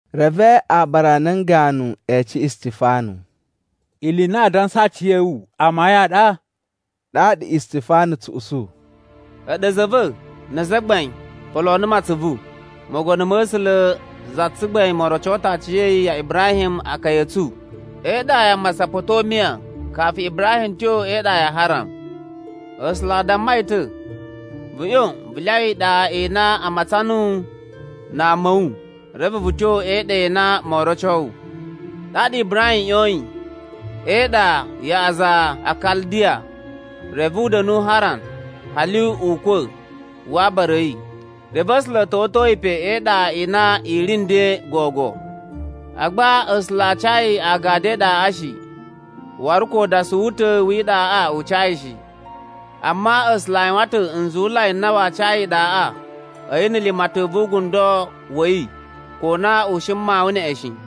Reve aabara a nan ganu e ece Istifanu, “Ili i na aa dansa a aciya̱wu amayun a ɗa?” Ɗaɗa Istifanu tsu usu, “A̱ɗu a̱za̱ a̱ va̱ na azagbain, poloo numu atsuvu! Mogono ma̱ A̱sula̱ za tsugbain mo roco ta̱ aciya̱yi ya Ibrahim akaya a̱ tsu e iɗa ya Masapotomiya kafu Ibrahim tyo e iɗa ya Haran. A̱sula̱ a damma yi ta̱, ‘Vu ꞌyon vu lyawa iɗa i na a matsan nuwu na ama a̱ wu, reve vu tyo e iɗa i na moo roco wu.’ “Ɗaɗa Ibrahim ꞌyoyin e iɗa ya aza a Kaldiya, reve u da̱nu Haran hali ukwa̱ wa abara a̱ yi. Reve A̱sula̱ a̱ ta̱wa̱to yi pa e iɗa i na i ri nden gogo. Agba A̱sula̱ a ca yi agadu e iɗaꞌa shi, waru ko udasuwu u ta̱ wi iɗaꞌa u ca yi shi. Amma A̱sula̱ a yuwan ta̱ nzuwulai n na waa ca yi iɗaꞌa a̱yi na̱ limatan vu ugundo wa̱ yi ko na u shi na̱ mawun neꞌen shi.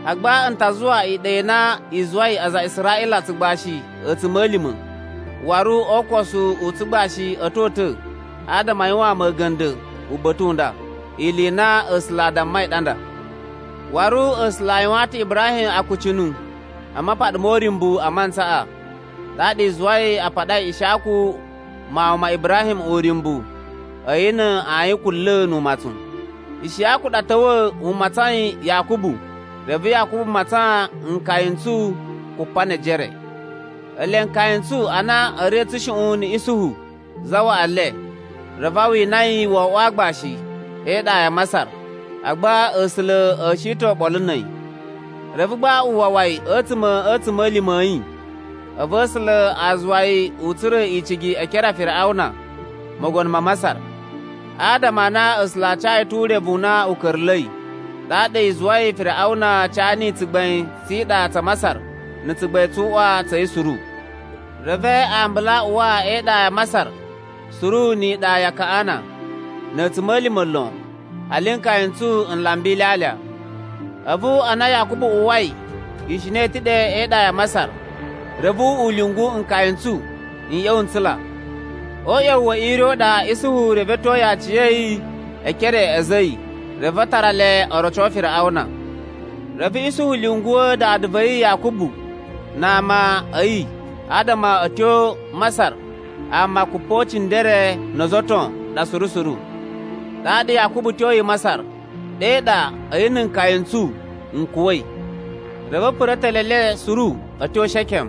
Agba n ta zuwa iɗa i na i zuwai aza a Israꞌila tsugbashi a̱tsuma̱lima̱. Waru o ukosu u tsugbashi a̱ to uta̱ adama a yuwaan mu a̱ga̱nda̱ uba̱ta̱ u nda.’ Ili i na A̱sula̱ a dammai ɗa nda. “Waru A̱sula̱ a yuwaan ta̱ Ibrahim akucunu a mapaɗa mo uryumbu a mantsaꞌa. Ɗaɗa i zuwai a paɗai Ishiyaku mawun ma Ibrahim uryumbu a̱yi na ayin kunla̱ nu umatsun. Ishiyaku ɗa ta̱wa̱ u matsain Yakubu, reve Yakubu matsan nkaya n tsu kupa ne ejere. “Ele nkaya n tsu ana a̱ ri a̱ tsushuꞌun na̱ Isuhu zawaꞌa le, reve a wina yi wo oꞌwo aagbashi e iɗa ya Masar. Agba A̱sula̱ a̱ shi ta̱ oɓolo na̱ a̱yi. Reve gba u wawa yi a̱tsuma̱ a̱ a̱tsuma̱lima̱ a̱ yi. A̱vu A̱sula̱ a zuwa yi u tsura̱ icigi e ekere a Firiꞌawuna, mogono ma Masar, adama a na A̱sula̱ a ca yi ta̱ urevu u na u ka̱ra̱la̱i. Ɗaɗa i zuwai Firiꞌawuna ca niyi tsugbain tsi iɗa tsa Masar na̱ tsugbain tsu uꞌwa tsa̱ yi suru. “Reve ambulu a uwa e iɗa ya Masar suru ni iɗa ya Kaꞌana, na̱ a̱tsuma̱lima̱ lon, hali nkaya n tsu n lamba ilyalya. A̱vu ana Yakubu uwwai ishina i ta̱ ɗe e iɗa ya Masar, reve u lyungu nkaya n tsu n ꞌya̱wa̱ n tsula. O uꞌya̱wu we ire u le ɗaɗa Isuhu revetyoi aciya̱yi e ekere a̱ a̱za̱ a̱ yi, reve a tara le o roco Firiꞌawuna. “Reve Isuhu lyunguwa̱ dada va̱ yi Yakubu na ama a̱ yi adama a̱ tyo Masar ama kupocindere no ozo o ton ɗa suru suru. Ɗaɗa Yakubu tyoyi Masar. Ɗe ɗa a̱yi na̱ nkaya n tsu n kuwa̱i. Reve a̱ pura̱ etele e le suru a̱ tyo Shekem,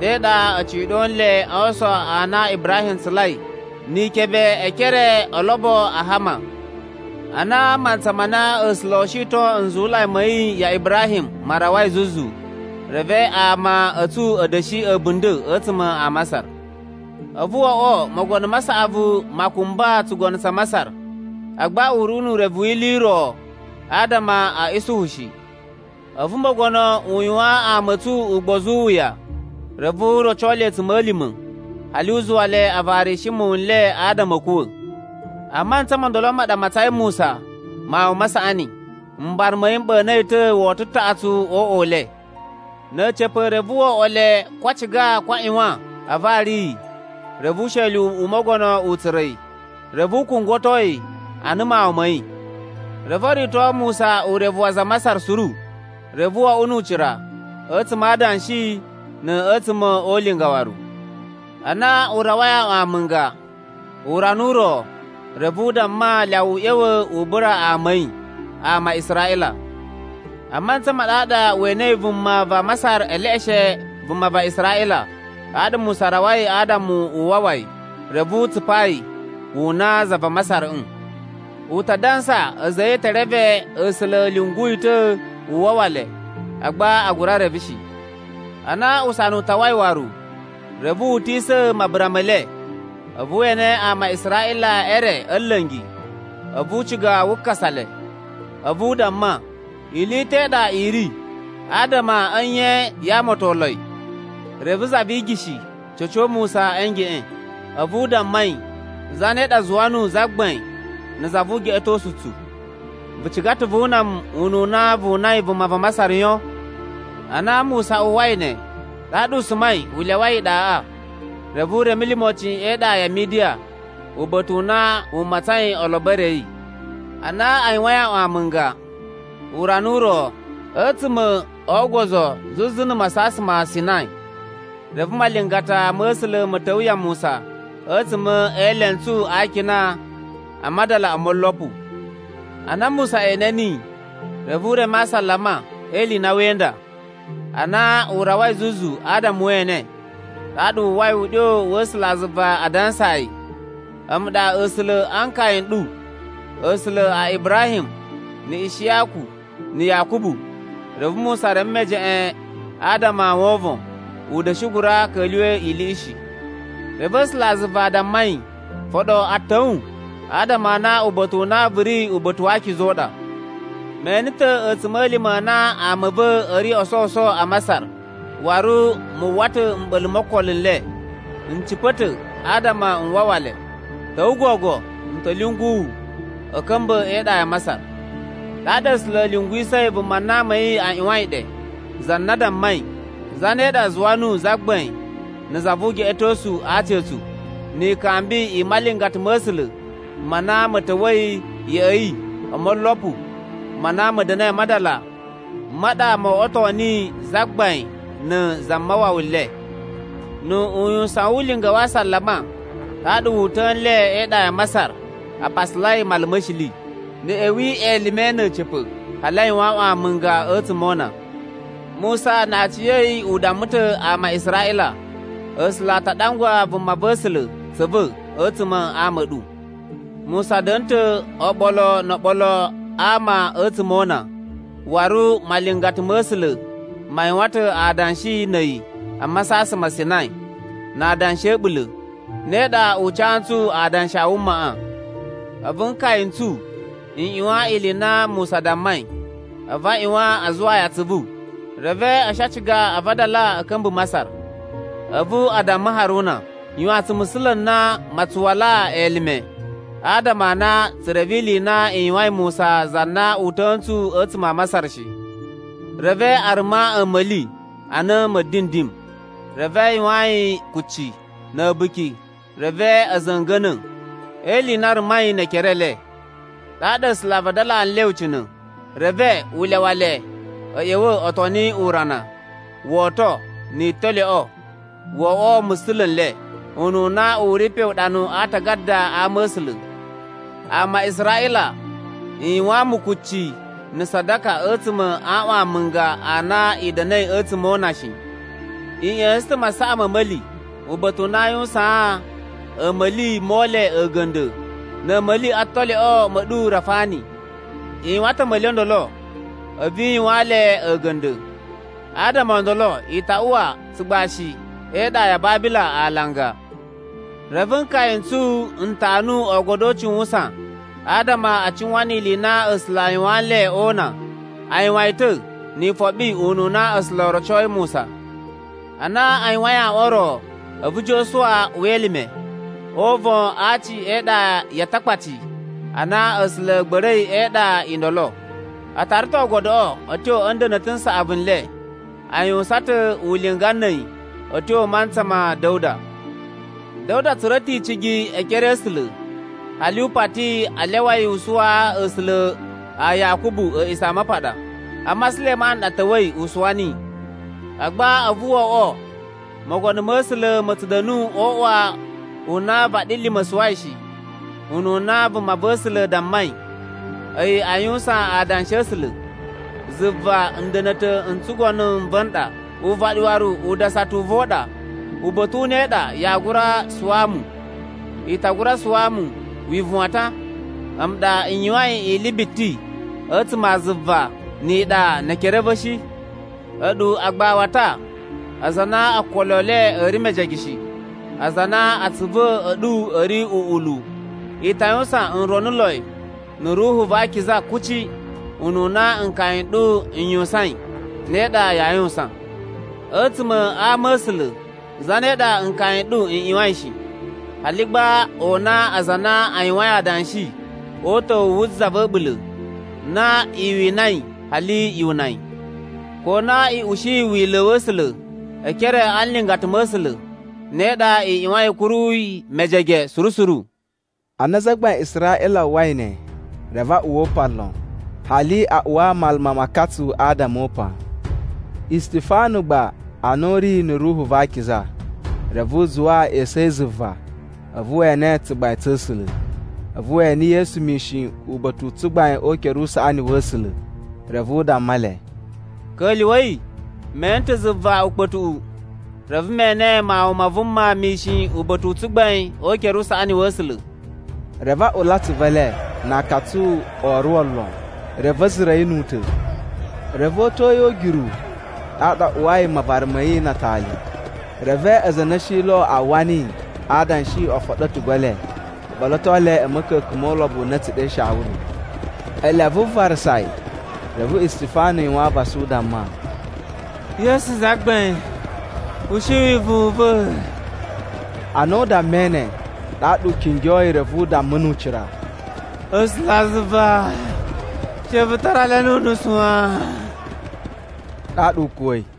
ɗe ɗa a̱ ciɗo nle a aason a na Ibrahim tsulai ni ikebe e ekere o olobo a Hama. “Ana mantsa ma na A̱sula̱ oo shiton nzuwulai ma̱ yi ya Ibrahim ma rawai zuzu, reve ama a̱ tsu a̱ da̱shi a̱bunda̱ a̱tsuma̱ a Masar. A̱vu wo oꞌwo mogono ma saꞌavu ma kumba tsugono tsa Masar, agba u ri nu urevu wi ili i ro adama a̱ Isuhu shi. A̱vu mogono u yuwaan ama a̱ tsu ugbozu u wuya, reve u roco le a̱tsuma̱lima̱, hali u zuwa le a varishi muwun n le adama a̱ kuwa̱. “A mantsa mo ndolo ma ɗa a matsain Musa mawun ma saꞌani. Mbara ma̱ yi m ɓa̱na̱ yi ta̱ woto taꞌatsu o uꞌwa u le. Na̱ a̱ca̱pa̱ reve wo oꞌwo le ko a ciga ko a ꞌyuwan a vari yi, reve usheli u mogono u tsura̱ yi, reve u kungwato yi ana mawun ma̱ yi. Reve o rito Musa urevu wa aza a Masar suru, reve wo oꞌwo nu ucira a̱tsuma̱ a adanshi na̱ a̱tsuma̱ o ulinga waru. “Ana u rawai aꞌwan amunga, urana u ro, reve u damma lyawa u ꞌya̱wa̱ u bura ama a̱ yi, ama a Israꞌila. A mantsa ma ɗaɗa we enei vuma va Masar e leꞌeshe vuma va Israꞌila. Ɗaɗa Musa rawai adama u wawa yi, reve u tsupaa yi wu una za va Masarꞌm. U ta dansa a̱za̱ a̱ yi e te reve A̱sula̱ a̱ lyungu yi ta̱ u wawa le, agba a gura reve shi. Ana usana u tawai waru, reve wu utisa̱ mabura me le, a̱vu we ene ama a Israꞌila e re a̱ nla̱ngi. A̱vu u ciga wu kasa le. A̱vu u damma, ‘Ili i ta̱ i ɗa i ri, adama a̱ nye yaa amatonloi?’ “Reve za vi igishi ca̱co Musa a̱ ngeꞌen, a̱vu u damma yi, ‘Zane ɗa zuwa nuwu zagbain na̱ za vu ugeꞌetosu u tsu? Vu ciga ta̱ vu una mu ununa vu unai vuma va Masar yon?’ Ana Musa uwwai ne, ɗaɗa u sumai u lyawai iɗaꞌa, reve u reme limocin e iɗa ya Midiya, uba̱ta̱ u na u matsain olobo e re a̱ yi. “Ana a yuwain aꞌwan amunga, urana u ro a̱tsuma̱ o ogozo zuzu na Masasan ma Sinai, reve malingata ma̱ A̱sula̱ ma̱ ta̱wa̱ ya Musa a̱tsuma̱ e elentsu a akina a madala o molopu. Ana Musa ene niyi, reve u reme asalama e ili i na wee inda. Ana u rawai zuzu adama we ene, ɗaɗa wu uwwai uɗyo wa̱ A̱sulazuva a dansaa yi, ‘A̱mu ɗa A̱sula̱ a nkaya n ɗu A̱sula̱ a Ibrahim, na̱ Ishiyaku, na̱ Yakubu.’ Reve Musa reme mejeꞌen adama o wovon, u da̱shi gura ka̱lyuwa̱ iliꞌi shi. “Reve A̱sulazuva a damma yi, ‘Foɗo atan a̱ wu adama a na uba̱ta̱ u na vu ri uba̱ta̱ wa akiza u ɗa. Me ene ta̱ a̱tsuma̱lima̱ a na ama a̱ va̱ a̱ ri o sowuso a Masar, waru mu uwwa ta̱ mɓa̱la̱ mo okolo n le. N cipa̱ ta̱ adama n wawa le. Ta̱wa̱ gogo, n ta̱ lyungu wu a̱ ka̱mba̱ e iɗa ya Masar.’ “Ɗaɗa A̱sula̱ a̱ lyunguwisa̱ vuma na ama a̱ yi a ꞌyuwain ɗe, za na a dammai, ‘Zane ɗa zuwa nuwu zagbain na̱ za vu ugeꞌetosu a aci a̱ tsu?’ Ni ikambi i malingata ma̱ A̱sula̱ ma na ma̱ ta̱wa̱i ya̱ꞌa̱ yi o molopu ma na ma̱ da̱na̱i a madala, ma ɗa mo oꞌwoto niyi zagbain na̱ zamawawa le. Nu uyuwusan wu ulinga wa asalama, ɗaɗa wu uta̱a̱ nle e iɗa ya Masar a pasalai Mala ma̱ Shili. Na̱ a̱ ꞌya̱wi elime na̱ a̱ca̱pa̱, hali a yuwan aꞌwan amunga a̱tsuma̱ o una. “Musa na aciya̱yi u damma ta̱ ama a Israꞌila, ‘A̱sula̱ a ta ɗangwa vumava̱sula̱ tsa̱ va̱ a̱tsuma̱ a ama a̱ ɗu.’ Musa da̱na̱ ta̱ oɓolo no oɓolo a ama a̱tsuma̱ o una. Waru malingata ma̱ A̱sula̱ ma yuwan ta̱ adanshi na̱ a̱yi a Masasan ma Sinai, na adanshi a̱ a̱ɓula̱. Ne ɗa u ca ntsu adanshi a wumaꞌa. “A̱vu nkaya n tsu n ꞌyuwan ili i na Musa dammai, a̱vu a ꞌyuwan a zuwaa yi atsuvu, reve a̱ shi a ciga a vadala a̱ ka̱mba̱ Masar. A̱vu a damma Haruna, ‘Yuwaan tsu musula̱ n na maa tsu walaa elime, adama a na tsu reve ili i na i yuwain Musa za na uta̱a̱ ntsu a̱tsuma̱ a Masar shi.’ Reve a ruma a̱ma̱li ana ma̱dindim, reve a yuwaan yi kucci, na̱ a̱buki reve a̱ za̱nga̱na̱ e ili i na a rumai ne ekere e le. Ɗaɗa A̱sula̱ a vadalaa nle ucina̱. Reve u lyawa le a̱ ꞌya̱wa̱ o toni urana, woto, ni italyoꞌo o oꞌwo musula̱ n le, ununa u ri pe uɗanu a aatagada a Ama̱sula̱: ‘Ama a Israꞌila, i yuwaan mu kucci na̱ sadaka a̱tsuma̱ a aꞌwan amunga a na i da̱na̱i a̱tsuma̱ o una shi. I ꞌya̱sa̱n ta̱ masaꞌa ma̱ a̱ma̱li uba̱ta̱ u na aa yuwusaan a̱a̱ma̱li Mole a̱ga̱nda̱ na̱ a̱a̱ma̱li a talyoꞌo ma̱ ɗu Rafani, i yuwan ta̱ a̱ma̱li o ndolo, a̱vu i yuwaan le a̱ga̱nda̱. Adama o ndolo i ta uwa a tsugbashi e iɗa ya Babila alanga!’ “Reve nkaya n tsu n tanu Oogodo o Ucuwusan adama a cuwan ni ili i na A̱sula̱ a yuwaan nle o una. A yuwan yi ta̱ ni ifoɓi ununa A̱sula̱ o rocoi Musa. Ana a yuwain aꞌwan o ro, a̱vu Josuwa uwa elime o uvon a aci e iɗa ya Atakpaci a na A̱sula̱ a̱ gba̱ra̱i e iɗa i ndolo. A tara ta̱ Oogodoꞌo a̱ tyo a̱ nda̱na̱ta̱ n saꞌavu n le. A yuwusan ta̱ ulinga na̱ a̱yi a̱ tyo mantsa ma̱ Da̱wuda. Da̱wuda tsura̱ ta̱ icigi e ekere a̱ A̱sula̱, hali u pati a lyawa yi u suwaa A̱sula̱ a Yakubu A̱a̱ꞌisamapaɗa. Amma Sulemanu ɗa ta̱wa̱i u suwa niyi. “Agba a̱vu wo oꞌwo Mogono ma̱ A̱sula̱ ma̱ tsu da̱nu o uꞌwa u na vaɗilima̱ suwai shi, ununa vumava̱sula̱ dammai, a̱yi a yuwusan adanshi a̱ A̱sula̱, ‘Zuva nda̱na̱ta̱ n tsugono n va̱ n ɗa, uvaɗi waru udasata u va̱ u ɗa. Uba̱ta̱ u ne u ɗa yaa gura suwaa mu? I ta gura suwaa mu wivuwatan? A̱mu ɗa n yuwain ili biti a̱tsuma̱ a zuva ni iɗa ne ekere a̱ va̱ shi?’ “A̱ɗu agbawata, aza a na okolo e le a̱ ri mejege shi, aza a na atsuvu a̱ ɗu a̱ ri uꞌulu. I ta yuwusan nronuloi na̱ Ruhu va Akiza kuci. Ununa nkaya n ɗu n yuwusain, ne ɗa yaa yuwusan. A̱tsuma̱ a ama̱sula̱ zane ɗa nkaya n ɗu n ꞌyuwain shi? Hali gba o una aza a na a yuwain adanshi o uta̱wu wu Za va̱ A̱ɓula̱ na i winai hali yu una yi. Ko a na i ushiyi Wila̱ wa̱ A̱sula̱ e ekere a nlingata ma̱ A̱sula̱, ne ɗa i ꞌyuwain a̱ kuru yi mejege suru suru.” Ana azagbain a Israꞌila a uwwai ne, reve a uwwa upan lon, hali a uwa maluma ma akatsu adama o upan. Istifanu gba ana u ri na̱ Ruhu va Akiza, reve u zuwa esu a̱ yi zuva a̱vu we ene tsugbain tsa̱ A̱sula̱. A̱vu we ene Yesu mishin uba̱ta̱ u tsugbain o ukere usaꞌani wa̱ A̱sula̱. Reve u damma le, “Ka̱lyuwa̱i, me ene ta̱ zuva ukpa̱tuꞌu, reve me ene Mawun ma Vuma mishin uba̱ta̱ u tsugbain o ukere usaꞌani wa̱ A̱sula̱!” Reve a ula atsuvu e le na akatsu o oruwo lon. Reve a̱ zura̱ yi nu u ta̱. Reve o uta̱a̱ yi o ugyuru, ɗaɗa a uwai mavara ma̱ yi na atali. Reve aza a na a̱ shi lo a uwwa niyi a adanshi o foɗo a̱tugu e le o ɓoloto le a̱ ma̱ka̱ka̱n mo ulobo u na a̱ tsu ɗe Shawulu. Ele a vuvarasa yi, reve Istifanu yuwan avasa u damma, “Yesu Zagbain, ushi wivuwun u va̱.” Ana u dammai ne, ɗaɗa u kingyoi reve u damma nu ucira, “A̱sulazuva she vu tara le nu unusu wan.” Ɗaɗa u kuwa̱i.